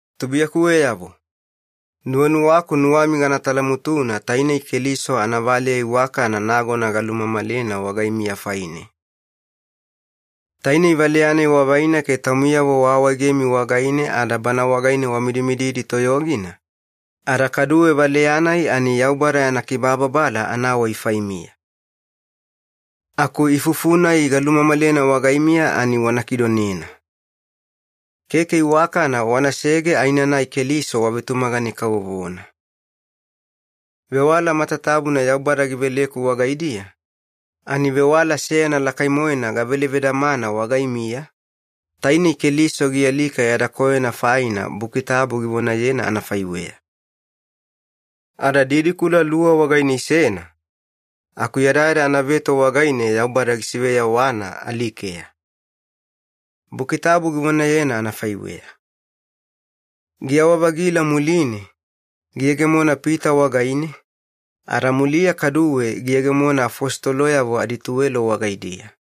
Tubuiyakuweyavo, nuwanuwaku nuwami gana talamutuna tainei Keliso anavaleya iwakana nagona galumamalena wagaimiya faine. Tainei valeya-nai wavaina ke taumiyavo waawaegemi wagaine ada bana wagaine wamidimididi toyogina, ada kaduwe valeya-nai ani Yaubada yana kibababala anawai faimiya. Aku ifufu-nai galumamalena wagaimiya ani wana kidonena. Keke iwakana wanasege aenanai Keliso wavetumagane kavovona. Vewala matatabuna Yaubada giveleku wagaidiya, ani vewala seyana lakai-moena gavele vedamana wagaimiya, tainei Keliso gialika yada koyona faina Buki Tabu givonayena anafaiweya. Ada didikula luwa wagaine isena, aku yadayada anaveto wagaine Yaubada gisiveyawana alikeya. Buki Tabu givonayena anafaiweya. Giyawa-vagila muline, giyegemona Pita wagaine, ada muliya kaduwe giyegemona afositoloyavo adituwelo wagaidiya.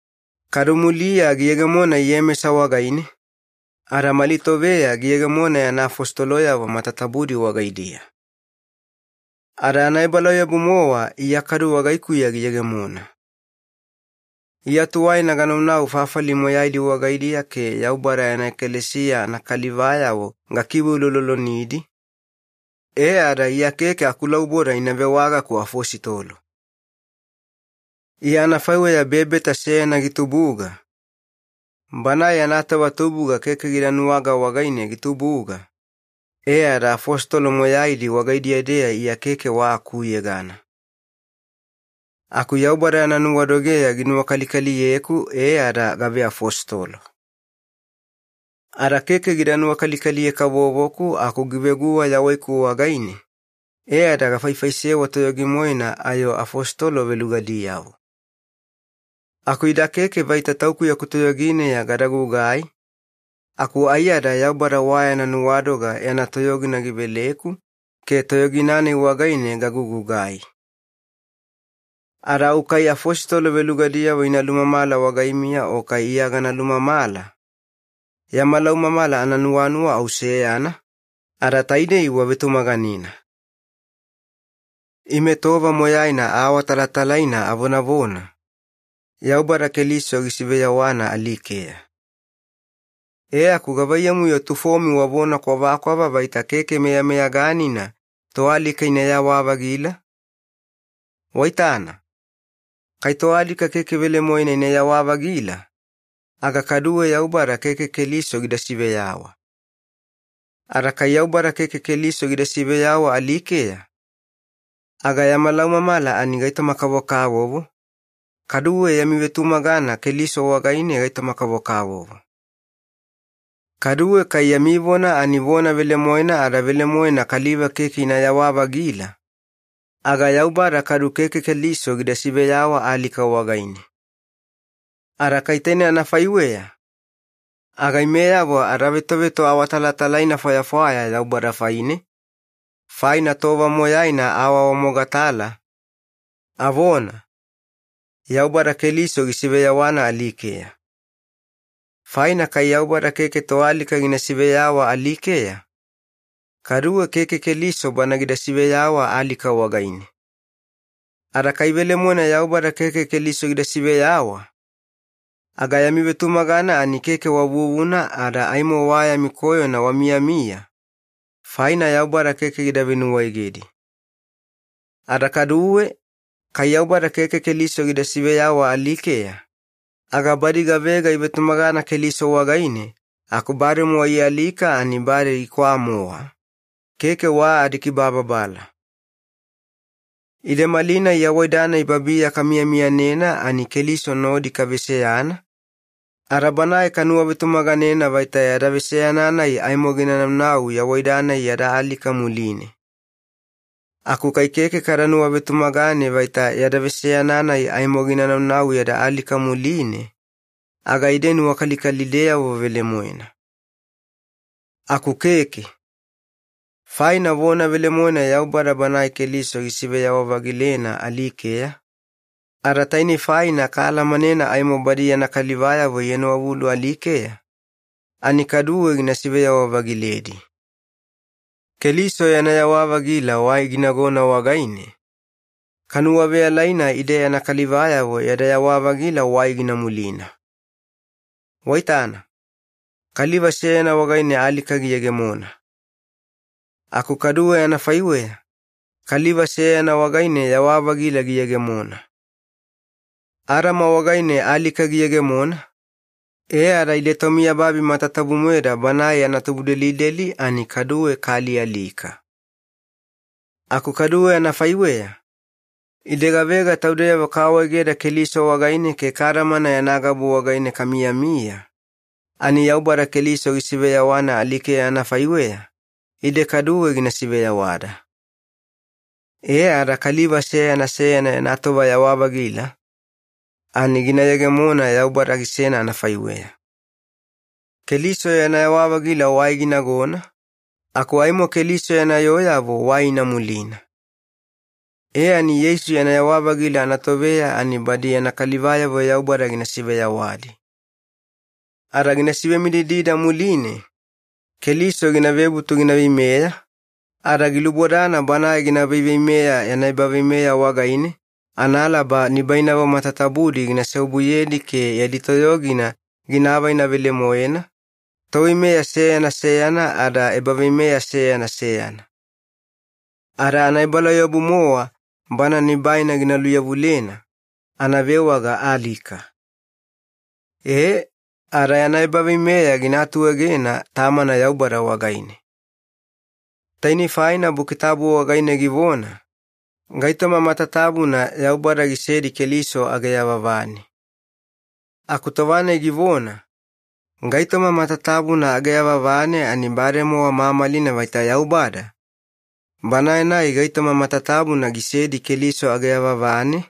Kadu muliya giyegemona Iyemesa wagaine, ada mali toveya giyegemona yana afositoloyavo matatabudi wagaidiya. Ada anaebalauyabu-mowa Iya kaduwe wagaikuya giyegemona. Iya tuwaina ganaunau fafali moyaidi wagaidiya ke Yaubada yana ekalesiya anakalivayavo gakiveuloulolonidi, e ada Iya keke akulauboda ina vewagaku afositolo. Iya anafaiweya bebeta seyana gitubuga, banae yana tova tubuga keke gida nuwaga wagaine gitubuga, e ada afositolo moyaidi wagaidiya-deya Iya keke wa akuyegana. Aku Yaubada yana nuwadogeya ginuwakalikaliyeku e ada gaveafositolo. Ada keke gida nuwakalikaliye-kavovoku aku giveguwa yawaiku wagaine, e ada gafaifaisewa toyogi-moena ayo afositolo velugadiyavo. Aku ida keke vaita tauku yaku toyogineya gada gugai, aku aiyada Yaubada wa yana nuwadoga yana toyogina giveleku ke toyogina-nai wagaine gagugugai. Ada au kai afositolo velugadiyavo ina lumamala wagaimiya o kai Iya gana lumamala, yama laumamala ananuwanuwa au seyana, ada taidei wavetumaganena. Ime tova moyaina aawatalatalaina avonavona, “Yaubada Keliso gisiveyawana alikeya.” E aku gavaiyamu-yo tufomi wavona kwavakwava vaita keke meyameyaganina toalika inayawa-vagila? Waitana, kai toalika keke velemoena inayawa-vagila, aga kaduwe Yaubada keke Keliso gida siveyawa. Ada kai Yaubada keke Keliso gida siveyawa alikeya, aga yama laumamala ani gaitoma-kavokavovo, kaduwe yami vetumagana Keliso wagaine gaitoma-kavokavovo. Kaduwe kai yami vona ani vona velemoena ada velemoena kaliva keke inayawa-vagila, aga Yaubada kadu keke Keliso gida siveyawa alika wagaine. Ada kai taine anafaiweya, aga imeyavo adavetove toawatalatalaina fwayafwaya Yaubada faine, faina tova moyaina awaawamogatala, avona, “Yaubada Keliso gisiveyawana alikeya.” Faina kai Yaubada keke toalika gina siveyawa alikeya, kaduwe keke Keliso Bana gida siveyawa alika wagaine. Ada kai velemoena Yaubada keke Keliso gida siveyawa, aga yami vetumagana ani keke wa vuvuna ada aimo wa yami koyona wamiyamiya, faina Yaubada keke gida venuwaegedi. Ada kaduwe, kai Yaubada keke Keliso gida siveyawa alikeya, aga badi gavega ivetumagana Keliso wagaine aku bademowa ialika ani bade ikwaa-mowa, keke wa adikibababala. Ide malinai yawaida-nai babiya kamiyamiyanena ani Keliso nodi kaveseyana, ada Banae kanuwavetumaganena vaita yada veseyana-nai aimo gina naunau yawaida-nai yada alika muline. Aku kai keke kada nuwavetumagane vaita yada veseyana-nai aimo gina naunau yada alika muline, aga ide nuwakalikalideyavo velemoena. Aku keke. Faina vona velemoena Yaubada Banae Keliso gisiveyawa-vagilena alikeya, ada tainei faina kaalamanena aimo badi yana kalivayavo ienowavulu alikeya ani kaduwe gina siveyawa-vagiledi. Keliso yana yawa-vagila wai ginagona wagaine, kanuwaveyalaina ide yana kalivayavo yada yawa-vagila wai gina mulina. Waitana, kaliva seyana wagaine alika giyegemona. Aku kaduwe anafaiweya, kaliva seyana wagaine yawa-vagila giyegemona. Adama wagaine alika giyegemona, e ada ide tomiyababi matatabu-moeda banae yana tubudelideli ani kaduwe kaalialika. Aku kaduwe anafaiweya, ide gavega taudeyavo kaawaegeda Keliso wagaine ke kadamana yana gabu wagaine kamiyamiya, ani Yaubada Keliso gisiveyawana alikeya anafaiweya, ide kaduwe gina siveyawada. E ada kaliva seyana seyana yana tova yawa-vagila, ani gina yegemona Yaubada gisena anafaiweya. Keliso yana yawa-vagila wai ginagona, aku aimo Keliso yana yooyavo wai ina mulina. E ani Yeisu yana yewa-vagila anatoveya ani badi yana kalivayavo Yaubada gina siveyawadi. Ada gina sivemididida muline, Keliso gina vebutu gina veimeya, ada gilubodana Banae gina veiveimeya yana ebaveimeya wagaine analaba nibainavo matatabudi gina seobuyedi ke yadi toyogina gina avaina velemoena, toveimeya seyana seyana ada ebaveimeya seyana seyana. Ada anaebalauyabu-mowa Bana nibaina gina luyavulena, anavewaga ‘alika’. Ee, ada yana ebaveimeya gina atuegena Tamana Yaubada wagaine. Tainei faina Buki Tabu wagaine givona, “Gaitoma matatabuna Yaubada gisedi Keliso age yavavane.” Aku tova-nai givona, “Gaitoma matatabuna age yavavane” ani bademowa mamalina vaita Yaubada, Banae-nai gaitoma matatabuna gisedi Keliso age yavavane,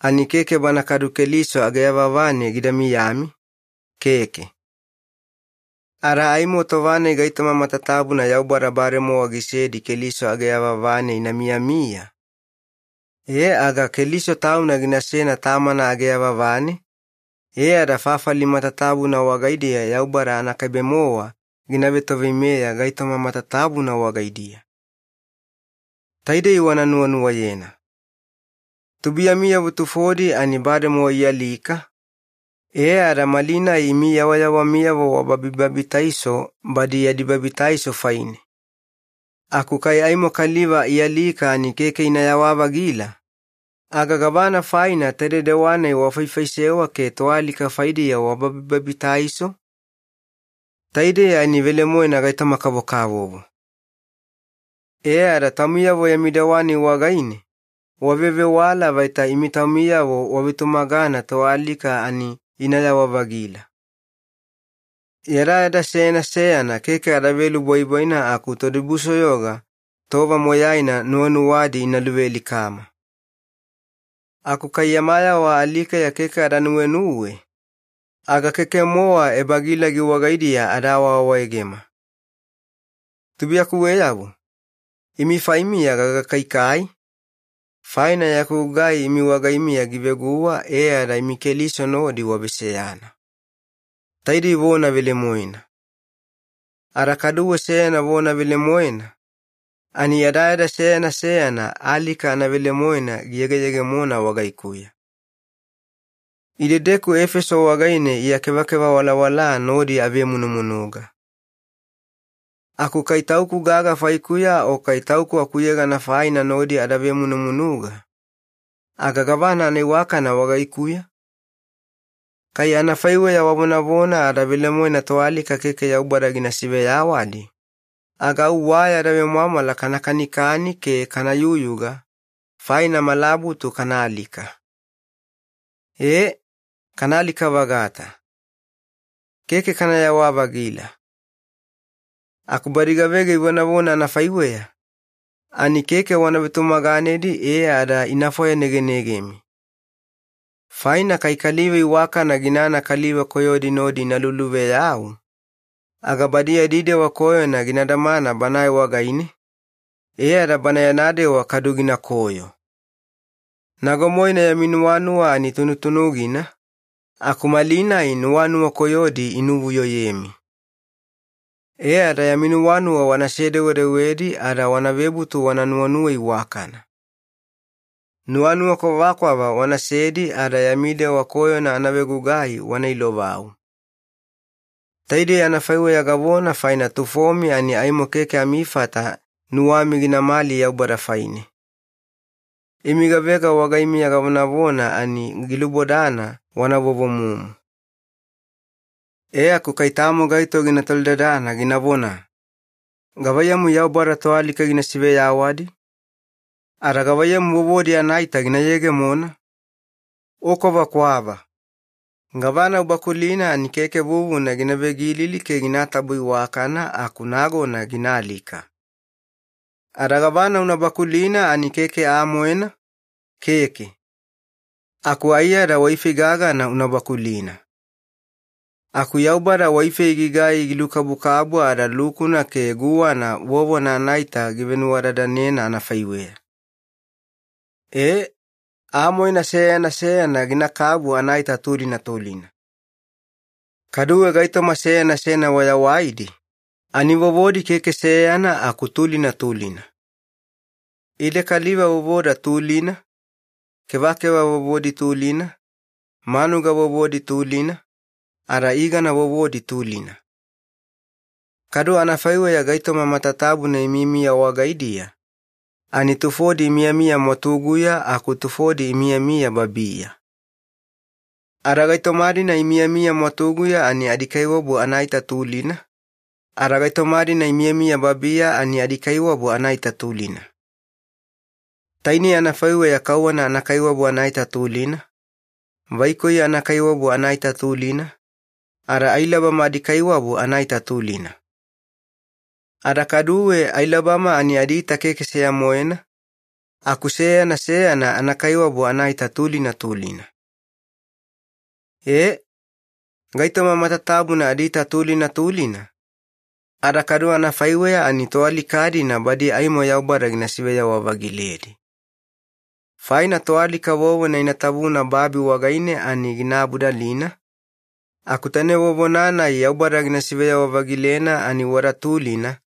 ani keke Bana kadu Keliso age yavavane gida miyami, keke. Ada aimo tova-nai gaitoma matatabuna Yaubada bademowa gisedi Keliso age yavavane ina miyamiya, e aga Keliso Tauna ginasena Tamana age yavavane, e ada fafali matatabuna wagaidiya Yaubada anakaibe-mowa gina vetoveimeya gaitoma matatabuna wagaidiya. Taidei wana nuwanuwayena. Tubuiyamiyavo tufodi ani bademowa ialika, e ada malinai imi yawayawamiyavo wababibabitaiso badi yadi babitaiso faine. Aku kai aimo kaliva ialika ani keke inayawa-vagila, aga gavana faina taide dewa-nai wafaifaisewa ke toalika faidiya wababibabitaiso? Taidei ani velemoena gaitoma-kavokavovo. E ada taumiyavo yami dewa-nai wagaine wavevewala vaita imi taumiyavo wavetumagana toalika ani inayawa-vagila. Yadayada seyana seyana keke ada velubwaibwaina aku todibusoyoga tova moyaina nuwanuwadi ina luvealikama. Aku kai yama yawa alikeya keke ada nuwenuwe, aga keke-mowa ebagilagi wagaidiya ada awaawaegema. Tubuiyakuweyavo, imi faimiya gagakaikai, faina yaku gugai imi wagaimiya giveguwa e ada imi Keliso nodi waveseyana. Taidei vona velemoena. Ada kaduwe seyana vona velemoena, ani yadayada seyana seyana alika anavelemoena giyegeyegemona wagaikuya. Idedeku Efeso wagaine Iya kevakeva walawala nodi avemunumunuga. Aku kai tauku gaga faikuya o kai tauku akuyegana faina nodi ada vemunumunuga, aga gavana anaiwakana wagaikuya? Kai anafaiweya wavonavona ada velemoena toalika keke Yaubada gina siveyawadi, aga au “wa yada vemwamwala kana kanikani ke kana yuyuga, faina malabutu kana alika.” E, kana alika-vagata. Keke kanayawa-vagila. Aku badi gavega ivonavona anafaiweya, ani keke wana vetumaganedi e ada ina fwayanegenegemi. Faina kai kaliva iwakana ginana kaliva koyodi nodi ina luluveyau, aga badi yadi dewa koyona gina damana banae wagaine, e ada bana yana dewa kadu ginakoyo. Nago-moena yami nuwanuwa ani tunutunugina, aku malinai nuwanuwa koyodi inuvuyoyemi. E ada yami nuwanuwa wana sedewedewedi ada wana vebutu wana nuwanuwa iwakana. Nuwanuwa kwavakwava wanasedi ada yami dewa koyona anavegugai wana ilovau. Taidei anafaiweya gavona faina tufomi ani aimo keke amifata nuwami ginamali Yaubada faine. Imi gavega wagaimiya gavonavona ani gilubodana wana vovomumu. E aku kai tamo gaito gina tolidadana ginavona, “Gavaiyamu Yaubada toalika gina siveyawadi? Ada gavaiyamu vovodi anaita gina yegemona?” O kwavakwava. Gavana ubakulina ani keke vuvuna gina vegilili ke ginatabo iwakana aku nagona gina alika. Ada gavana una bakulina ani keke aa-moena, keke. Aku aiyada waifei gagana una bakulina. Aku Yaubada waifei gigai gilukabukabu ada lukuna ke guwana vovona anaita givenuwadadanena anafaiweya. E, aa-moena seyana seyana ginakabu anaita tulina tulina. Kaduwe gaitoma seyana seyana wayawaidi, ani vovodi keke seyana aku tulina tulina. Ide kaliva vovoda tulina, kevakeva vovodi tulina, manuga vovodi tulina, ada igana vovodi tulina. Kadu anafaiweya gaitoma matatabuna imiyamiya wagaidiya, ani tufodi imiyamiya mwatuguya aku tufodi imiyamiya babiya. Ada gaitoma-dina imiyamiya mwatuguya ani adikaiwabu anaita tulina, ada gaitoma-dina imiyamiya babiya ani adikaiwabu anaita tulina. Tainei anafaiweya kauwana anakaiwabu anaita tulina, vaikoi anakaiwabu anaita tulina, ada ailabama adikaiwabu anaita tulina. Ada kaduwe ailabama ani adiita keke seya-moena, aku seyana seyana anakaiwabu anaita tulina tulina. E, gaitoma matatabuna adiita tulina tulina, ada kadu anafaiweya ani toalika-dina badi aimo Yaubada gina siveyawa-vagiledi. Faina toalika vovona ina tavuna babi wagaine ani gina abudalina, aku taine vovona-nai Yaubada gina siveyawa-vagilena ani wada tulina,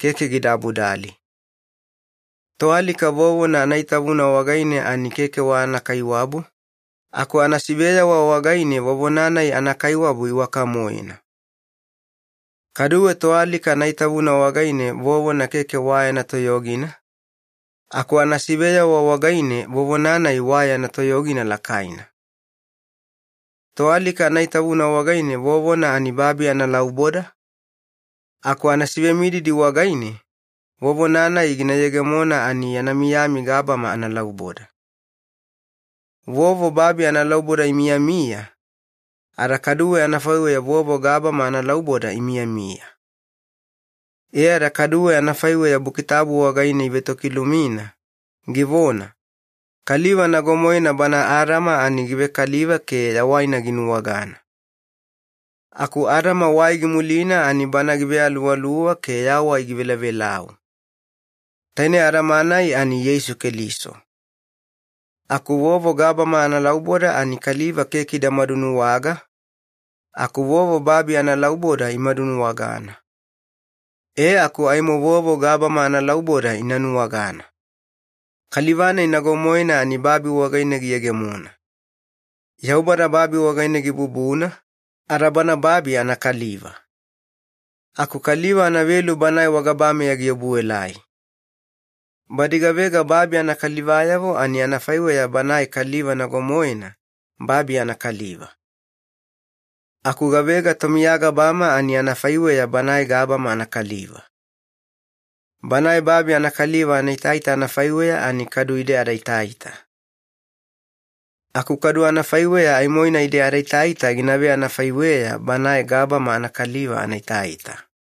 keke gida abudali. Toalika vovona anaitavuna wagaine ani keke wa anakaiwabu, aku anasiveyawa wagaine vovona-nai anakaiwabu iwaka-moena. Kaduwe toalika anaitavuna wagaine vovona keke wa yana toyogina, aku anasiveyawa wagaine vovona-nai wa yana toyogina lakaina. Toalika anaitavuna wagaine vovona ani babi analauboda, aku anasivemididi wagaine, vovona-nai gina yegemona ani yana miyami gabama analauboda. Vovo babi analauboda imiyamiya, ada kadu anafaiweya vovo gabama analauboda imiyamiya. E ada kaduwe anafaiweya Buki Tabu wagaine ivetokilumina, givona, “Kaliva nago-moena bana Adama ani givekaliva ke yawaina ginuwagana.” Aku Adama wai gimulina ani Bana givealuwaluwa ke yawai givelavelau. Taine Adama-nai ani Yeisu Keliso. Aku vovo gabama analauboda ani kaliva keke ida madunuwaga, aku vovo babi analauboda imadunuwagana. E aku aimo vovo gabama analauboda ina nuwagana. Kaliva-nai nago-moena ani babi wagaine giyegemona. Yaubada babi wagaine gibubuna, ada bana babi anakaliva. Aku kaliva anavelu Banae wagabameya giobuelai. Badi gavega babi anakalivayavo ani anafaiweya banae kaliva nago-moena, babi anakaliva. Aku gavega tomiya gabama ani anafaiweya Banae gabama anakaliva. Banae babi anakaliva anaitaita anafaiweya ani kadu ide adaitaita. Aku kadu anafaiweya aimoina ide adaitaita gina veanafaiweya Banae gabama anakaliva anaitaita.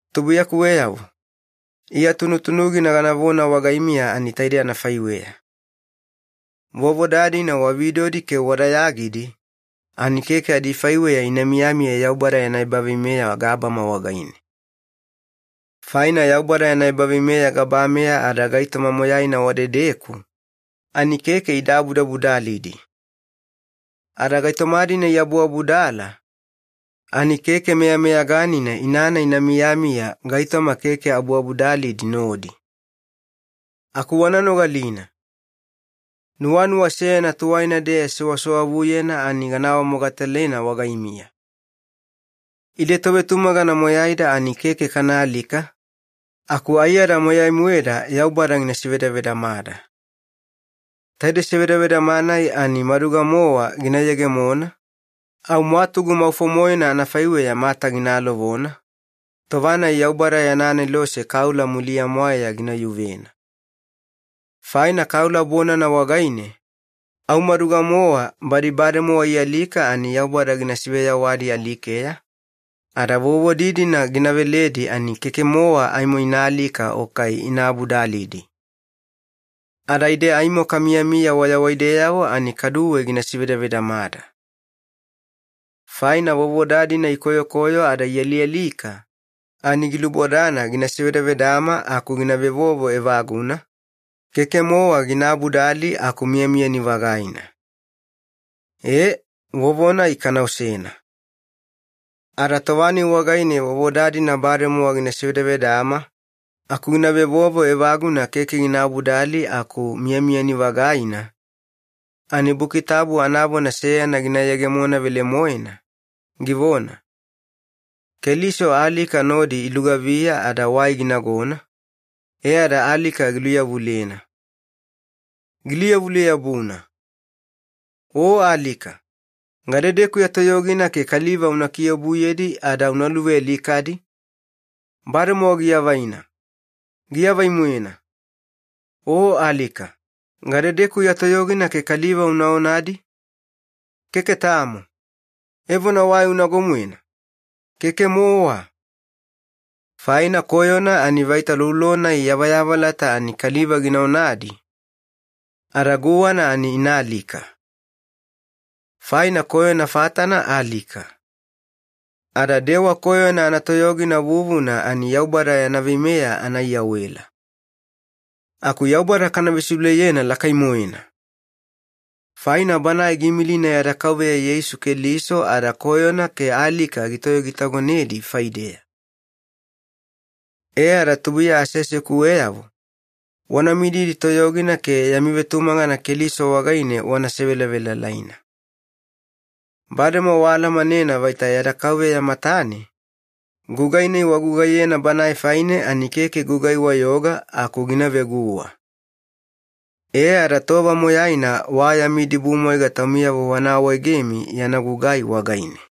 Tubuiyakuweyavo, Iya tunutunugina ganavona wagaimiya ani taide anafaiweya. Vovoda-dina wa vidodi ke wa dayagidi, ani keke adifaiweya ina miyamiya Yaubada yana ebaveimeya gabama wagaine. Faina Yaubada yana ebaveimeya gabameya ada gaitoma moyaina wadedeku, ani keke ida abuabudalidi. Ada gaitoma-dina iabuabudala, ani keke meyameyaganina inana ina miyamiya gaitoma keke abuabudalidi nodi. Aku wana nogalina! Nuwanuwa seyana tuwaina-deya sewasewavuyena ani gana awamogatalena wagaimiya. Ide tovetumagana moyaida ani keke kana alika, aku aiyada moyai-moeda Yaubada gina sivedavedamada. Taide sevedavedama-nai ani maduga-mowa gina yegemona, au mwatugu maufo-moena anafaiweya mata gina alovona, tova-nai Yaubada yana anelose kaula muliya-mwaeya gina yuvena. Faina kaula bonana wagaine, au maduga-mowa badi bademowa ialika ani Yaubada gina siveyawadi alikeya, ada vovodi-dina gina veledi ani keke-mowa aimo ina alika o kai ina abudalidi. Ada ide aimo kamiyamiya wayawaideyavo ani kaduwe gina sivedavedamada. Faina vovoda-dina ikoyokoyo ada ialialika, ani gilubodana gina sevedavedama aku gina vevovo evaguna, keke-mowa gina abudali aku miyamiyani-vagaina. E, vovo-nai kana osena. Ada tova-nai wagaine vovoda-dina bademowa gina sevedavedama aku gina vevovo evaguna keke gina abudali aku miyamiyani-vagaina, ani Buki Tabu anavona seyana gina yegemona velemoena, givona, “Keliso alika nodi ilugaviya ada wai ginagona, e ada alika giluyavulena. Giluyavule-yabuna!” “O alika, gadedeku ya toyogina ke kaliva una kiobuyedi ada una luvealikadi? Bademowa giavaina, giavai-moena. O alika, gadedeku ya toyogina ke kaliva una onadi? Keke tamo. Evona wai unago-moena? Keke-mowa!” Faina koyona ani vaita loulo-nai yavayavalata ani kaliva gina onadi, ada guwana ani ina alika. Faina koyona fatana alika. Ada dewa koyona anatoyogina vuvuna ani Yaubada yana veimeya anaiyawela. Aku Yaubada kana vesiuleyena lakai-moena! Faina Banae giimilina yada Kauveya Yeisu Keliso ada koyona ke alika gitoyogitagonedi faideya. E ada tubuiya aseasekuweyavo, wana mididi toyogina ke yami vetumagana Keliso wagaine wana sevelavelalaina. Bademowa waalamanena vaita yada Kauveya matane, gugai-nai wagugaiyena Banae faine ani keke gugai-wayoga aku gina veguwa. E ada tova moyaina wa yami idibumwaiga taumiyavo wana awaegemi yana gugai wagaine.